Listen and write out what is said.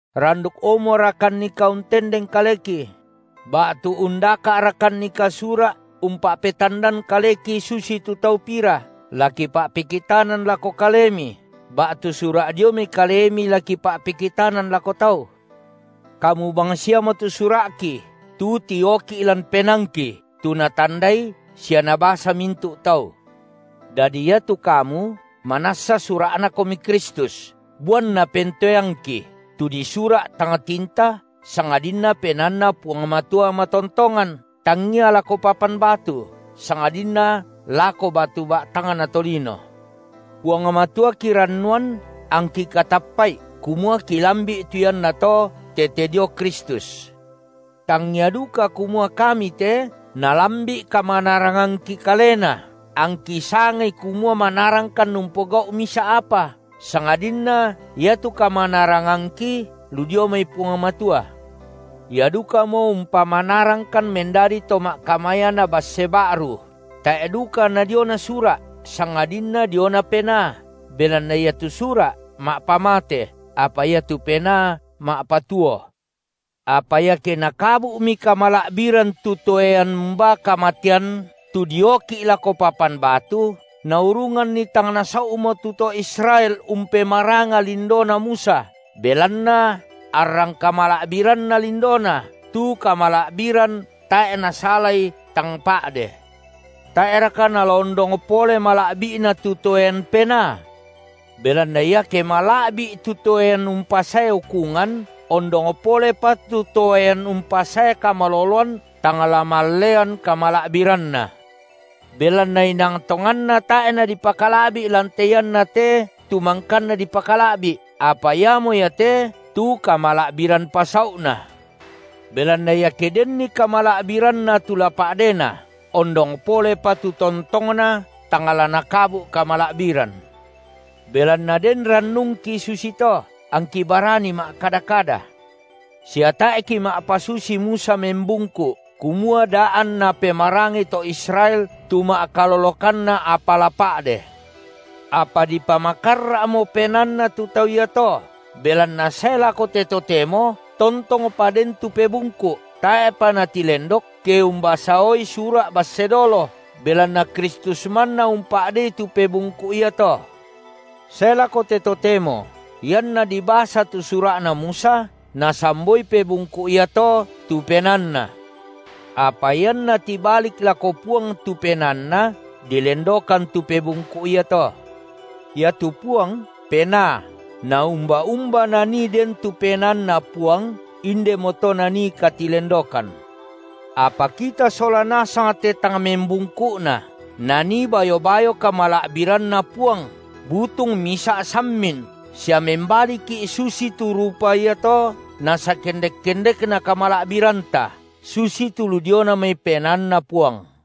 Randukomorakannika untendeng kaleki? Ba’tu undaka’rakannika sura’ umpa’petandan kaleki susitu tau pira, la kipa’pekitanan lako kalemi, ba’tu sura’ dio mai kalemi la kipa’pekitanan lako tau? Kamu bangsiamo tu sura’ki, tu tioki’ lan penaangki, tu natandai sia nabasa mintu’ tau. Dadi iatu kamu, manassa sura’Nakomi Kristus, buanna pentoeangki, tu disura’ tang tinta, sangadinna penaanNa Puang Matua matontongan, tangngia lako papan batu, sangadinna lako batu ba’tangna tolino. Puang Matua kirannuan angki katappa’i kumua kilambi’ tu iannato tete dio Kristus. Tangngia duka kumua kami te nalambi’ kamanarangangki kalena angki sangai kumua manarangkan umpogau’ misa’ apa, sangadinna iatu kamanarangangki lu dio mai Puang Matua. Ia dukamo umpamanarangkan mendadi to ma’kamayana basse ba’ru, tae’ duka na diona sura’, sangadinna diona Penaa, belanna iatu sura’ ma’pamate, apa iatu Penaa ma’patuo. Apa iake nakabu’mi kamala’biran tu toean umbaa kamatean, tu dioki’ lako papan batu, naurunganni tang nasau’mo tu to Israel umpemaranga lindona Musa, belanna arrang kamala’biranna lindona, tu kamala’biran tae’ nasalai tang pa’de, tae’raka nala ondong pole mala’bi’na tu toean Penaa? Belanna iake mala’bi’i tu toean umpasae ukungan, ondong polepa tu toean umpasae kamaloloan tang la mallean kamala’biranna. Belanna inang tonganna tae’ nadipakala’bi’ lan te iannate tu mangkanna dipakala’bi’, apa iamo iate tu kamala’biran pasau’na. Belanna iake denni kamala’biranna tu la pa’dena, ondong polepa tu tontongna tang la nakabu’ kamala’biran. Belanna den rannungki susito, angki barani ma’kada-kada, sia tae’ kima’pasusi Musa membungku’, kumua da anna pemarangai to Israel tu ma’kalolokanna apa la pa’de. Apa dipamakarra’mo penaanna tu tau iato belanna sae lako te totemo tontongpa den tu pebungku’, tae’pa natilendok, ke umbasaoi sura’ basse dolo, belanna Kristus manna umpa’dei tu pebungku’ iato. Sae lako te totemo, ianna dibasa tu sura’na Musa, nasamboi pebungku’ iato tu penaanna. Apa ianna tibalik lako Puang tu penaanna, dilendokan tu pebungku’ iato. Iatu Puang, Penaa, na umba-umba nanii den tu PenaanNa Puang, indemo to nanii katilendokan. Apa kita sola nasang te tang membungku’na, nanii bayo-bayo kamala’biranNa Puang butung misa’ sammin, sia membaliki’ susitu rupa iato nasakendek-kendekna kamala’biranta, susitu lu diona mai PenaanNa Puang.